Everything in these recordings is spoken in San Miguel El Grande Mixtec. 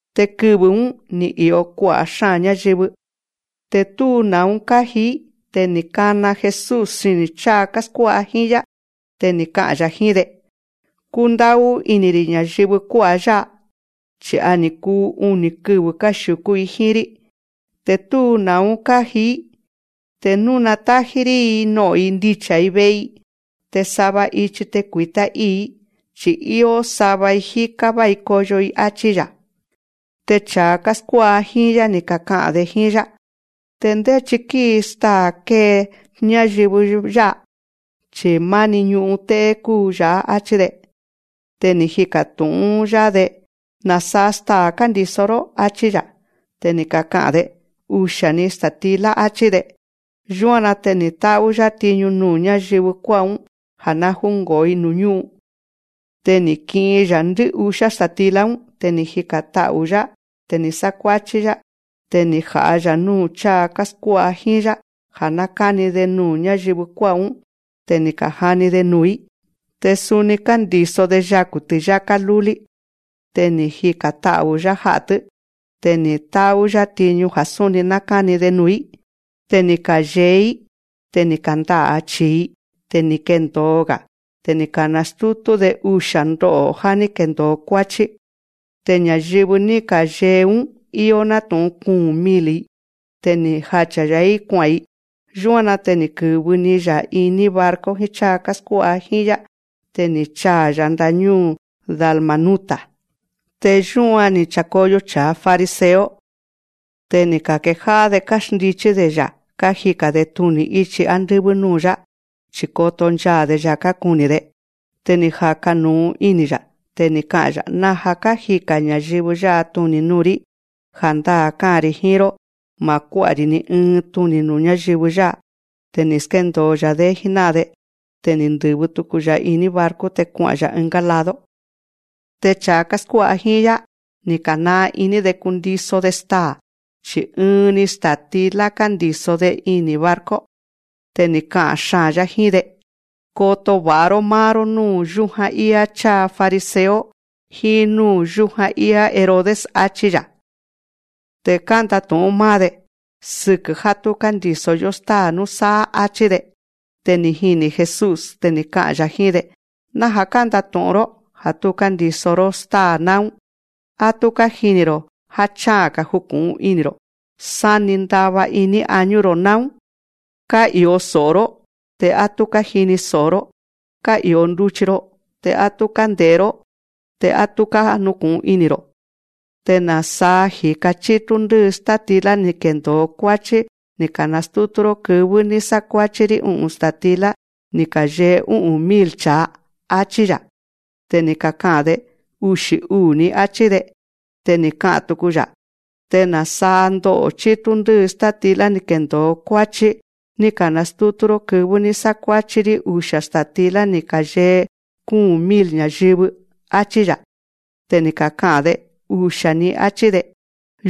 Te kɨvɨ̱‑ún, ni̱ i̱o kua'a̱ xáa̱n ñáyɨvɨ, te tú na̱ún káji‑í. Te ni̱ kana Jesús xini̱ cháa káskuá'a jíín‑yá. Te ni̱ ka'a̱n‑ya̱ jíín‑de: Kúndá'ú ini̱‑ri̱ ña̱yɨvɨ kuá'a̱ yá'a, chi̱ a ni̱ kuu uni̱ kɨvɨ̱ káxiu̱kú‑i jíín‑rí, te tú na̱ún káji‑í. Te nú natájí‑rí‑i no'o̱n ndicha̱‑i ve'e‑i, te sava ichi te kui̱tá ii̱‑í, chi̱ íó sava‑i jíká vái koyo‑i, áchí‑ya̱. Te cha̱a káskuá'a jíín‑yá, ni̱ kaka'a̱n‑de jíín‑yá: Te ndéchi kíi staa̱ kée ndá'a̱ chi̱i ña̱yɨvɨ yá'a, chi̱ máni ñu'un té'é kúu yá'a. Achí‑de. Te ni̱ jika̱ tu̱'ún‑yá‑de: Na̱saa staa̱ kándi̱so‑ró. Achí‑ya̱. Te ni̱ kaka'a̱n‑de: Usia̱‑ni sta̱tilá, áchí‑de. Yúan‑na te ni̱ tá'ú‑yá tiñu nuu̱ ñáyɨvɨ kuá'a̱‑ún ja̱ ná júngo̱o‑i nuu̱ ñú'un. Te ni̱ ki'in‑ya̱ ndɨ́'usiá sta̱tilá‑ún. Te ni̱ jika̱n ta'u̱‑yá. Te ni̱ sákuáchí‑yá. Te ni̱ ja̱'a‑ya̱ núu̱ cháa káskuá'a jíín‑yá, ja̱ ná káni‑de nuu̱ ñáyɨvɨ kuá'a̱‑ún. Te ni̱ ka̱jani‑de nuu̱‑í. Te suni kándi̱so‑de yaku̱ ti̱yáká lúlí. Te ni̱ jika̱n ta'u̱‑yá ja'a̱‑tɨ́. Te ni̱ tá'ú‑yá tiñu ja̱ súni ná káni‑de nuu̱‑í. Te ni̱ ka̱yee‑í. Te ni̱ kanda'a̱ chi̱i‑i. Te ni̱ kendo̱o‑ga̱. Te ni̱ ka̱nastútú‑de usia̱ ndo'o̱ já ní kendo̱o kuáchí. Te ña̱yɨvɨ ní ka̱yee‑ún íó nátu̱'un kuu̱n mil‑i. Te ni̱ jacha̱‑ya̱‑í kua'a̱n‑i. Yúan‑na te ni̱ kɨ̱vɨ‑ni‑ya̱ iní barco jíín cháa káskuá'a jíín‑yá. Te ni̱ chaa̱‑ya̱ ndáñúu̱ Dalmanuta. Te yúan ni̱ cha̱koyo cha̱a fariseo. Te ni̱ ka̱kejá'á‑de káxndichí‑de‑ya̱ kájika̱n‑de tuni̱ ichi ándɨ́vɨ́ núu̱‑yá chi̱ koto nchaa̱‑de‑ya̱ kákuni̱‑de. Te ni̱ jaka̱ nu̱u ini̱‑ya̱. Te ni̱ ka'a̱n‑ya̱: Naja̱ kájika̱n ña̱yɨvɨ yá'a tuni̱ nuu̱‑rí. Ja̱ndáa̱ ká'a̱n‑ri̱ jíín‑ró ma̱ kuá'a‑ri̱ ni ɨɨn tuni̱ nuu̱ ñáyɨvɨ yá'a. Te ni̱ skéndo̱o‑ya̱‑dé jíná'an‑de. Te ni̱ ndɨ̱vɨ tuku‑ya̱ iní barco, te kua'a̱n‑ya̱ ɨngá lado. Te cha̱a káskuá'a jíín‑yá, ni̱ ka̱naa iní‑de kundiso‑de staa̱. Chi̱ ɨɨn‑ni sta̱tilá kándi̱so‑de ini̱ barco. Te ni̱ ka'a̱n xaa̱n‑yá jíín‑de: Koto va̱'a‑ró máá‑ró núu̱ yújan íá cháa fariseo jíín núu̱ yújan íá Herodes, áchí‑ya̱. Te kándatu̱'ún máá‑de: Sɨkɨ̱ já tú kándi̱so‑yó stáa̱ núsáá, áchí‑de. Te ni̱ jini̱ Jesús. Te ni̱ ka'a̱n‑ya̱ jíín‑de: Naja̱ kándatu̱'ún‑ró. Ja̱ tú kándi̱so‑ró stáa̱ náún. Á tú kájini̱‑ro̱. Á cha'a̱n‑ga̱ juku̱'un ini̱‑ro̱. Sáni ndava iní añú‑ro̱ náún. Ká'i̱o so̱'o‑ró, te á tú kájini so̱'o‑ró. Ká'i̱o nduchi‑ro, te á tú kánde̱'é‑ró, te á tú kánuku̱'un ini̱‑ro̱. Te na̱saa ji̱ka chítú ndɨ́ɨ státilá ni̱ kendo̱o kuáchí ní ka̱nastútú‑ró kɨvɨ́ ní sákuáchí‑rí u'u̱n sta̱tilá ni̱ ka̱yee ú'u̱n mil cha̱a, áchí‑ya̱. Te ni̱ kaka'a̱n‑de: Uxi̱ uu̱‑ni, áchí‑de. Te ni̱ ka'a̱n tuku‑ya̱: Te na̱saa ndo'o̱ chítú ndɨ́ɨ státilá ni̱ kendo̱o kuáchí ní ka̱nastútú‑ró kɨvɨ́ ní sákuáchí‑rí usia̱ sta̱tilá ni̱ ka̱yee kúu̱n mil ña̱yɨvɨ, áchí‑ya̱. Te ni̱ kaka'a̱n‑de: Usia̱‑ni, áchí‑de.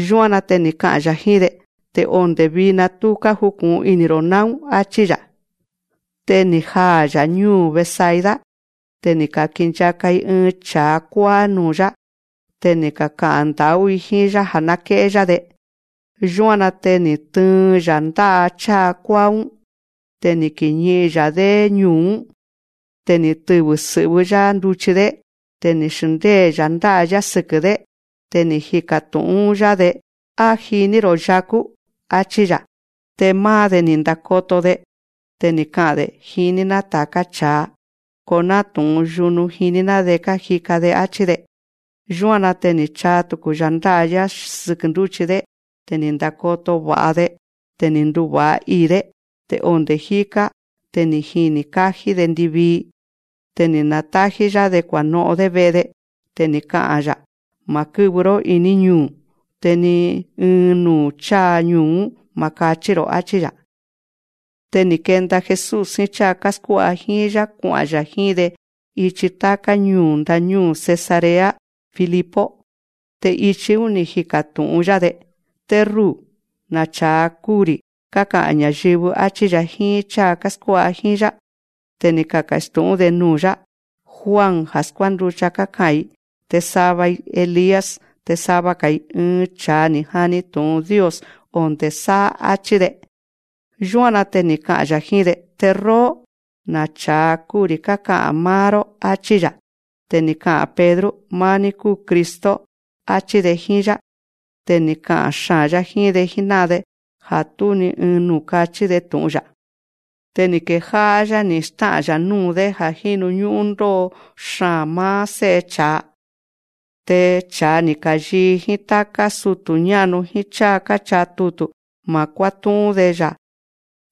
Yúan‑na te ni̱ ka'a̱n‑ya̱ jíín‑de: Te onde̱ vina tú kájuku̱'un ini̱‑ro̱ náún, áchí‑ya̱. Te ni̱ jaa̱‑ya̱ ñúu̱ Betsaida. Te ni̱ ka̱kinchaka‑i ɨɨn cha̱a kuáá núu̱‑yá. Te ni̱ kaka'a̱n nda̱'ú‑i jíín‑yá ja̱ ná ké'é‑yá‑de. Yúan‑na te ni̱ tɨɨn‑ya̱ ndá'a cháa kuáá‑ún. Te ni̱ kiñi'in‑ya̱‑dé ñuu̱‑ún. Te ni̱ tɨvɨ̱ sɨ̱'vɨ́‑yá nduchi‑dé. Te ni̱ xndée‑ya̱ ndá'a‑yá sɨkɨ̱‑dé. Te ni̱ jika̱ tu̱'ún‑yá‑de: Á jiní‑ro̱ yakú, áchí‑ya̱. Te máá‑de, ni̱ ndakoto‑de. Te ni̱ ka'a̱n‑de: Jiní‑ná ta̱ká cha̱a. Ko nátu̱'un yunu jiní‑ná‑de kájika‑de, áchí‑de. Yúan‑na te ni̱ chaa tuku‑ya̱ ndá'a‑yá sɨkɨ̱ ndúchi‑dé. Te ni̱ ndakoto va̱'a‑de. Te ni̱ nduva̱'a ii̱‑dé. Te onde̱ jíká te ni̱ jini̱ kájí‑de ndivii. Te ni̱ na̱tájí‑yá‑de kua̱no'on‑dé ve'e‑de. Te ni̱ ka'a̱n‑ya̱: Ma̱ kɨ́vɨ‑ró iní ñuu̱. Te ni ɨɨn nuu̱ cháa ñuu̱‑ún ma̱ kachí‑ro̱, áchí‑ya̱. Te ni̱ kenda Jesús jíín cháa káskuá'a jíín‑yá kua'a̱n‑ya̱ jíín‑de ichi táká ñuu̱ ndañúu̱ Cesarea de Filipo. Te ichi‑ún ni̱ jika̱ tu̱'ún‑yá‑de: Te ruu̱, na̱ cha̱a kúu‑ri̱ káka'a̱n ña̱yɨvɨ, áchí‑ya̱ jíín cháa káskuá'a jíín‑yá. Te ni̱ kaka̱stu̱'ún‑de nuu̱‑yá: Juan ja̱ skuánducha, káka'a̱n‑i. Te sava‑i: Elías. Te sava‑ga̱‑i: Ɨɨn cha̱a ni̱ jani tu̱'un Dios onde̱ sáá, áchí‑de. Yúan‑na te ni̱ ka'a̱n‑ya̱ jíín‑de: Te róó, na̱ cha̱a kúu‑ri̱ káka'a̱n máá‑ró, áchí‑ya̱. Te ni̱ ka'a̱n Pedro: Máá‑ní kúu Cristo, áchí‑de jíín‑yá. Te ni̱ ka'a̱n xaa̱n‑yá jíín‑de jíná'an‑de ja̱ tú ni ɨɨn nuu̱ kachí‑de tu̱'un‑ya̱. Te ni̱ kejá'á‑yá ni̱ stá'a̱n‑ya̱ núu̱‑dé ja̱ jínu ñú'ún ndó'o xaa̱n máá Sé'e cha̱a. Te cha̱a ni̱ ka̱yii jíín táká sutu̱ ñá'nu jíín cháa káchaa tutu̱ ma̱ kuátú'ún‑de‑ya̱,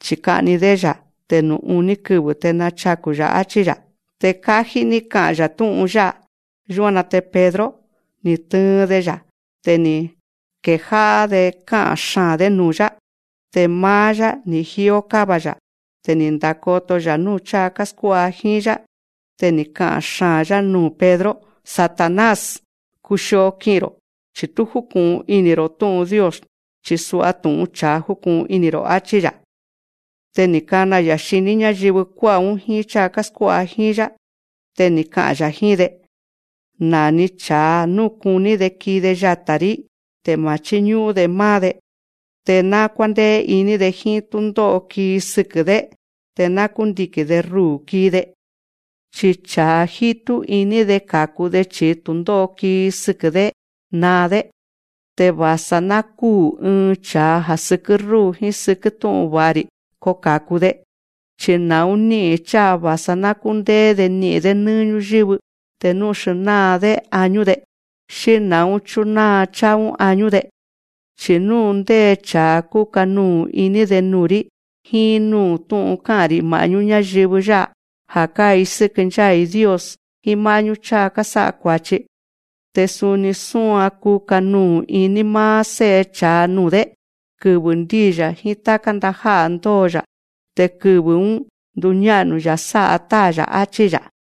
chi̱ ka'ni‑dé‑ya̱. Te nuu̱ uní kɨvɨ̱ te nachaku̱‑ya̱, áchí‑ya̱. Te kájí ní ka'a̱n‑ya̱ tú'un yá'a. Yúan‑na te Pedro, ni̱ tɨɨn‑de‑ya̱. Te ni̱ kejá'á‑de ká'a̱n xaa̱n‑dé nuu̱‑yá. Te máá‑yá, ni̱ jíó káva‑ya̱. Te ni̱ ndakoto‑ya̱ núu̱ cháa káskuá'a jíín‑yá. Te ni̱ ka'a̱n xaa̱n‑yá nuu̱ Pedro: Satanás, kuxio ki'i̱n‑ro̱, chi̱ tú júku̱'un ini̱‑ro̱ tú'un Dios, chi̱ sa tu̱'un cha̱a júku̱'un ini̱‑ro̱, áchí‑ya̱. Te ni̱ kana‑ya̱ xiní ñáyɨvɨ kuá'a̱‑ún jíín cháa káskuá'a jíín‑yá. Te ni̱ ka'a̱n‑ya̱ jíín‑de: Na̱ni cha̱a nú kuní‑de kii‑de yata̱‑rí, te ma̱ chíñú'ún‑de máá‑de, te ná kuándéé iní‑de jíín túndó'o kii sɨkɨ̱‑dé, te ná kúndiki̱n‑de ruu̱ kii‑de. Chi cha̱a jítú iní‑de ka̱ku‑de chi̱i tu̱ndó'o kii sɨkɨ̱‑dé, naa‑dé. Te va̱sa ná kúu̱ ɨɨn cha̱a ja̱ sɨkɨ́ rúu̱ jíín sɨkɨ́ tú'un va̱'a‑ri̱, ko ka̱ku‑de. Chi na̱ún ní'i̱n cháa va̱sa ná kúndéé‑de ni'i̱n‑dé nɨ́ɨ́ ñúyɨ́vɨ, te nú xnáa‑dé añú‑de. Xí na̱ún chúnáa cháa añú‑de. Chi̱ nú ndé cha̱a kúka nuu̱ iní‑de nuu̱‑rí jíín núu̱ tú'un ká'a̱n‑ri̱ ma̱'nú ñáyɨvɨ yá'a ja̱ kái̱sɨ́kɨ ncháa̱‑i Dios jíín má'ñú cháa kásá'a kua̱chi, te suni súan kuka nuu̱ iní máá Sé'e cha̱a nuu̱‑dé, kɨvɨ̱ ndíi‑ya̱ jíín táká ndajá'a̱ ndóo‑ya̱. Te kɨvɨ̱‑ún ndúñá'nu‑ya̱ sá'a Táa̱‑ya̱, áchí‑ya̱.